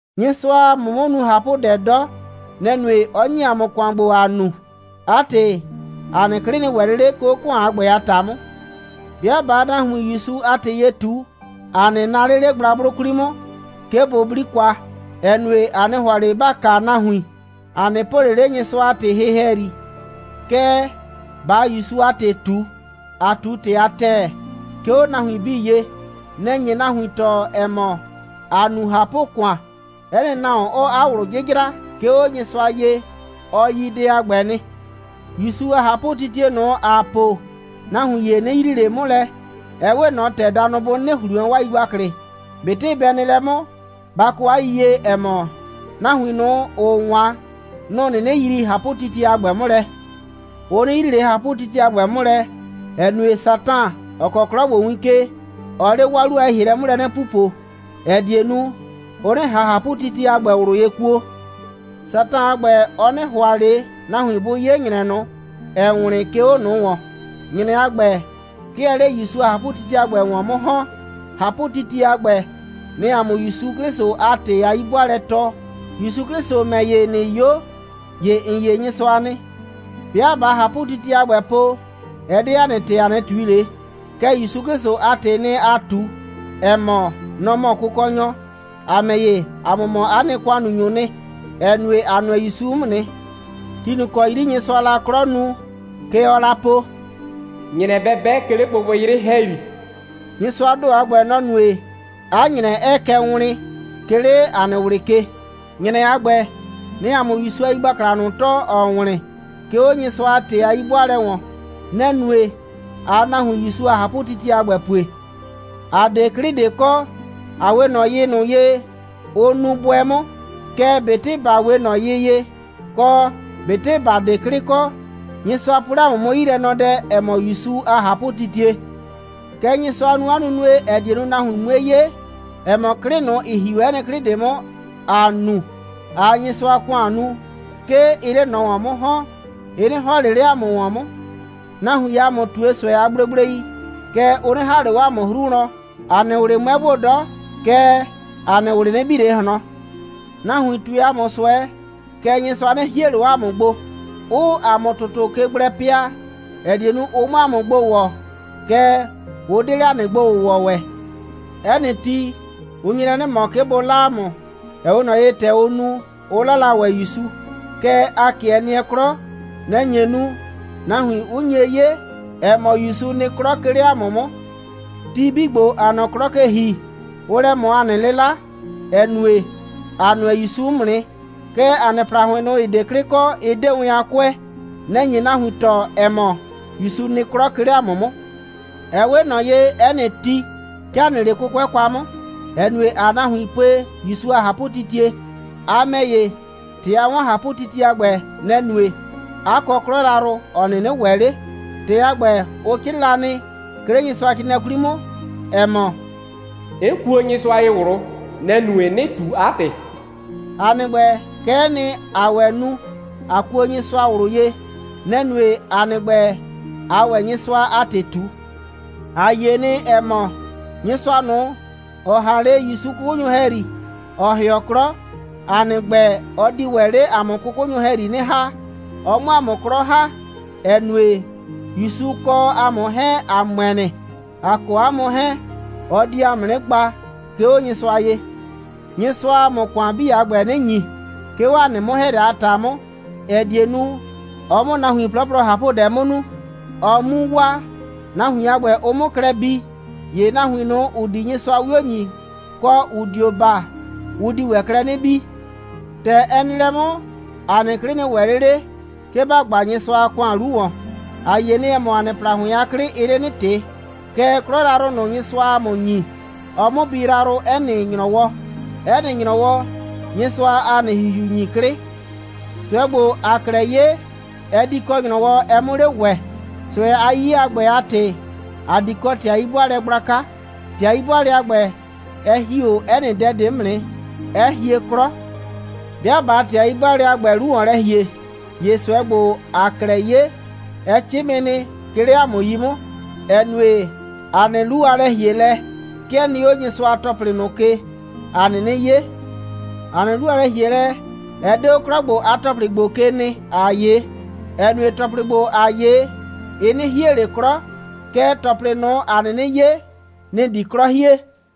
Nyɩsʋaa ‑a mʋ 'mʋ nu ꞊hapʋdɛ 'dɔ. Nɛ‑ nue, 'ɔ ‑nyi ‑a mʋ ‑kʋan ‑gbo, ‑aa nu. 'A ‑tɩ, ‑a nɩ 'klɩ 'nɩ ‑wɛ ꞊le 'le, 'ke 'o ‑kʋan a ‑gbɛ a ‑ta 'mʋ. 'Bɩa ꞊baa nahuin ‑Yusu a ‑tɩ ye ꞊tu, ‑a 'nɩ naa ꞊le 'le gblagblʋ 'kwli 'mʋ, 'ke bʋ 'bli kwa, ‑ɛ nue, ‑a 'nɩ ‑hʋa ꞊le ‑ba kaa nahuin. ‑A 'nɩ po ꞊le 'le Nyɩsʋa a ‑tɩ hɩ ‑hɛyri. Kɛɛ, ꞊baa ‑Yusu a ‑tɩ ꞊tu, ‑aa ꞊tu ‑tɩ a ‑tɛɛ, 'ke 'o nahuin 'bii ye. Nɛ‑ nye nahuin tɔɔ, ‑ɛ mɔ, ‑aa nu ꞊hapʋ‑kʋan. 'Ɛ nɩ nahuon, ‑ɔɔ 'a ꞊wlʋ 'jɩjra, 'ke 'o Nyɩsʋa ye, ɔ yi dɛ a ‑gbɛ nɩ. ‑Yusu a ꞊hapʋtitie ꞊nʋ, ‑aa po, nahuin ‑ye 'nɩ yrii ꞊le 'mʋ lɛ, ‑ɛ 'we ꞊nɔ ‑tɛ danʋ bʋ 'nɩnɩ ‑hli wɛn 'waa yigbaklɩ. ꞊Betɩ bɛ nɩ lɛ 'mʋ, ba kɔ 'a yiyie, ‑ɛ mɔ, nahuin ꞊nʋ, ‑ʋʋ 'wan, nʋ‑ 'nɩnɩ yrii ꞊hapʋtitie a ‑gbɛ 'mʋ lɛ. Ʋ 'nɩ yrii ꞊le ꞊hapʋtitie a ‑gbɛ 'mʋ lɛ, ‑ɛ nue, Satan, ‑ɔ kɔɔ 'klɔ ‑gbo win ke, ɔɔ 'le 'waa 'lu a lɛ‑hielɛ 'mʋ lɛ 'nɩ pupo, ‑ɛ die nu, ʋ 'nɩ ꞊han ꞊hapʋtitie a ‑gbɛ ꞊wlʋ ye kuo. Satan a ‑gbɛ, ɔ 'nɩ ‑hʋa ꞊le nahuin bʋ 'ye ‑nyrɛ ꞊nʋ, ‑ɛɛ wlɩn, 'ke 'o ꞊nʋ ‑wɔn. ‑Nyrɛ a ‑gbɛ, 'ke ɛɛ 'le ‑Yusu a ꞊hapʋtitie a ‑gbɛ ‑wɔn 'mʋ ‑hɔn. ꞊Hapʋtitie a ‑gbɛ, nɛ‑ɛ ‑a mʋ ‑Yusu 'Klɩsʋ a ‑tɩ a 'yi'bʋaalɛ tɔɔ. ‑Yusu 'Klɩsʋ ‑mɛ ‑ye, ꞊nɩ 'yo, ‑ye ‑n 'ye Nyɩsʋa nɩ. 'Bɩa ꞊baa ꞊hapʋtitie a ‑gbɛ po, ɛ 'de ‑a nɩ ‑tɩ, ‑a 'nɩ ꞊tui ꞊le. Kɛɛ, ‑Yusu 'Klɩsʋ a ‑tɩɩ nɩ, ‑aa ꞊tu, ‑ɛ mɔ, nɔ‑ mɔ Kʋkɔnyɔ. ‑A ‑mɛ ‑ye, ‑a mʋ mɔ 'a nɩ ‑kʋannunyʋʋ nɩ, ‑ɛ nue, ‑a nʋɛ ‑Yusu 'mʋ nɩ. Ti ꞊nʋ ‑kɔ 'yri Nyɩsʋaa la 'klɔ nu, kɛ ɔɔ la po: «‑Nyrɛ bɛ 'bɛ, 'ke 'le gbɩgbɩyrɩ ‑hɛyri.» Nyɩsʋaa ‑do a ‑gbɛ, nɔ‑ nue, 'a ‑nyrɛ 'ɛɛ kɛ wlɩn, 'ke 'le ‑a nɩ ꞊wlɩ ke. ‑Nyrɛ a ‑gbɛ, nɛ‑ɛ ‑a mʋ ‑Yusu a yigbakla ꞊nʋ tɔɔ, ‑ɔɔ wlɩn, 'ke 'o Nyɩsʋa a ‑tɩ a 'yi'bʋaalɛ ‑wɔn. Nɛ‑ nue, ꞊aa nahuin ‑Yusu a ꞊hapʋtitie a ‑gbɛ pue. ‑A 'de 'klɩ ꞊de kɔ. ‑A 'we ꞊nɔ yɩ ꞊nʋ ye, ʋ nuu bʋɛ 'mʋ. Kɛɛ, ꞊betɩ ‑ba 'we ꞊nɔ yɩ ye, kɔ, ꞊betɩ ‑ba 'de 'klɩ kɔ, Nyɩsʋa po 'le ‑a mʋ 'mʋ 'yilɛnɔdɛ, ‑ɛ mɔ ‑Yusu a ꞊hapʋtitie. Kɛ Nyɩsʋa nu 'a nunue, ‑ɛ die nu, nahuin 'mue 'ye, ‑ɛ mɔ, 'klɩ ꞊nʋ, ‑ɩ ‑hi 'o 'ɛ nɩ 'klɩ ꞊de 'mʋ, ‑aa nu, ꞊aa Nyɩsʋa a ‑kʋan nu, 'ke ɩɩ 'le ꞊nɔ ‑wɔn 'mʋ ‑hɔn. Ɩ 'nɩ ‑hɔn ꞊le 'le ‑a mʋ ‑wɔn 'mʋ. Nahuiin ‑a mʋ ꞊tue ꞊sʋɛ a gblegblei, kɛɛ, ʋ 'nɩ ‑ha ꞊le 'o ‑a mʋ 'hru wlɔn. ‑A nɩ ꞊wlɩ 'mʋɛ gbo 'dɔ, kɛɛ, ‑a nɩ ꞊wlɩ 'nɩ bi ꞊le ꞊hlɔn. Nahuiin ꞊tue ‑a mʋ ꞊sʋɛ, kɛɛ, Nyɩsʋa 'nɩ hie ꞊le 'o ‑a mʋ gbo, 'ʋʋ ‑a mʋ ‑tʋtʋ ke gblɛ pɩa, ‑ɛ die nu, ʋ 'mʋ ‑a mʋ gbo ‑wɔ, kɛɛ, ʋ 'de 'le ‑a nɩ gbo‑wʋwɔ ‑wɛ. 'Ɛ nɩ ti, ʋ nye lɛ 'nɩ ꞊mɔ, 'ke bʋ 'la ‑a mʋ, ‑ɛ 'we ꞊nɔ ye, ‑tɛ ʋ nu, 'ʋ 'la la ‑wɛ ‑Yusu. Kɛɛ, ‑a 'kɩɛ nɩɛ 'klɔ. Nɛ‑ nye nu, nahuin 'ʋ nye 'ye, ‑ɛ mɔ, ‑Yusu nɩ 'klɔ, 'ke 'le ‑a mʋ 'mʋ. Ti 'bii ‑gbo, ‑aa nɔ 'klɔ ke ‑hi, ʋʋ lɛ ꞊mɔ ‑a nɩ 'lɩla, ‑ɛ nue, ‑a nʋɛ ‑Yusu 'mʋ nɩ. Kɛɛ, ‑a nɩ ‑plahʋɩn ꞊nʋ, ‑ɩ 'de 'klɩ kɔ, ɩ 'de wɛn a 'kʋɛ. Nɛ‑ nye nahuin tɔɔ, ‑ɛ mɔ, ‑Yusu nɩ 'klɔ, 'ke 'le ‑a mʋ 'mʋ. Ɛ 'we ꞊nɔ ye, 'ɛ nɩ ti, 'ke ‑a nɩ 'le 'kʋkʋɛ kwa 'mʋ, ‑ɛ nue, ‑aa nahuin pue ‑Yusu a ꞊hapʋtitie. A ‑mɛ ‑ye, ‑tɛ a 'wɔn ꞊hapʋtitie a ‑gbɛ, nɛ‑ nue, 'a kɔ 'klɔ yrayrʋ, ‑ɔ 'nɩnɩ ‑wɛ 'le. ‑Tɩ a ‑gbɛ, ʋ 'crɩɩ la nɩ, 'ke 'le Nyɩsʋacrɩɩnɩɛ 'kwli 'mʋ, ‑ɛ mɔ: «'N kuo Nyɩsʋa ye ꞊wlʋ. Nɛ‑ nue, 'nɩ ꞊tu 'a ‑tɩ.» ‑A nɩ ‑gbɛ, kɛ'ɛ nɩ, ‑aa ‑wɛ nu, ꞊a kuo Nyɩsʋa ꞊wlʋ ye. Nɛ‑ nue, ‑a nɩ ‑gbɛ, ꞊aa ‑wɛ Nyɩsʋa a ‑tɩ ꞊tu. ‑A yie nɩ, ‑ɛ mɔ, Nyɩsʋa ꞊nʋ, ‑ɔ ‑ha 'le ‑Yusu 'kʋkʋnyʋ ‑hɛyri, ‑ɔ ‑hɩɔ 'klɔ, ‑a nɩ ‑gbɛ, ɔ di ‑wɛ 'le ‑a mʋ 'kʋkʋnyʋ ‑hɛyri 'nɩ ‑ha, ɔ 'mʋ ‑a mʋ 'klɔ ‑ha, ‑ɛ nue, ‑Yusu kɔ ‑a mʋ 'hɛɛn, ‑a ‑mʋɛ nɩ. A kɔ ‑a mʋ 'hɛɛn, ɔ di ‑a mʋ 'nɩ gba, 'ke 'o Nyɩsʋa ye. Nyɩsʋaa ‑a mʋ ‑kʋan 'bii a ‑gbɛ 'nɩ ‑nyi, 'ke 'o 'a nɩ 'mʋ‑hɛɛlɛ a ‑ta 'mʋ, ‑ɛ die nu, ɔ 'mʋ nahuin 'plɔplɔ ꞊hapʋdɛ 'mʋ nu, ɔ 'mu waa, nahuin a ‑gbɛ, ʋ 'mʋ klɛ bii. ‑Ye nahuin ꞊nʋ, ‑ʋ di Nyɩsʋa 'wio ‑nyi, kɔ, ‑ʋ dio baa, ʋ di ‑wɛ klɛ 'nɩ bii. ‑Tɛ ɛ nɩ lɛ 'mʋ, ‑a nɩ 'klɩ 'nɩ ‑wɛ ꞊le 'le, 'ke ‑ba gba Nyɩsʋa a ‑kʋan 'lu ‑wɔn. ‑A yie nɩ, ‑ɛ mɔ, ‑a nɩ ‑plahʋɩn a 'klɩ, ɩɩ 'le 'nɩ ꞊tɩ, kɛɛ, 'klɔ yrayrʋ ꞊nʋ, Nyɩsʋaa ‑a mʋ ‑nyi, ɔɔ 'mʋ bi yrayrʋ 'ɛ nɩ ‑nyrɔwɔ. 'Ɛ nɩ ‑nyrɔwɔ, Nyɩsʋaa ‑a nɩ ‑hihiu ‑nyi 'klɩ. ꞊Sʋɛ ‑gbo, ‑aa 'klɛɛ 'ye, ɛ di kɔ ‑nyrɔwɔ, ɛ 'mʋ 'le ‑wɛ. ꞊Sʋɛ a 'yiye a ‑gbɛ a ‑tɩ, ‑a di kɔ ‑tɩ a 'yi'bʋaalɛ gblaka. ‑Tɩ a 'yi'bʋaalɛ a ‑gbɛ, ɛ ‑hi 'o 'ɛ nɩ dɛ ꞊de 'mʋ nɩ, 'ɛ hie 'klɔ. 'Bɩa ꞊baa ‑tɩ a 'yi'bʋaalɛ a ‑gbɛ 'lu ‑wɔn lɛ ‑hie, ‑ye ꞊sʋɛ ‑gbo, ‑aa 'klɛɛ 'ye, ɛ 'cɩmɩ nɩ, 'ke 'le ‑a mʋ 'yi 'mʋ, ‑ɛ nue, ‑a nɩ 'lu a lɛ‑hielɛ, 'ke ɛ nɩ 'o Nyɩsʋa a ‑tɔplɩ ꞊nʋ ke, ‑a 'nɩnɩ 'ye. ‑A nɩ 'lu a lɛ‑hielɛ, ɛ 'de 'o 'klɔ ‑gbo a ‑tɔplɩ ‑gbo ke nɩ, ‑aa 'ye, ‑ɛ nue, ‑tɔplɩ ‑gbo, ‑aa 'ye, ɩ 'nɩ hie ꞊le 'klɔ, kɛɛ, ‑tɔplɩ ꞊nʋ, ‑a 'nɩnɩ 'ye, nɩ‑ di 'klɔ hie.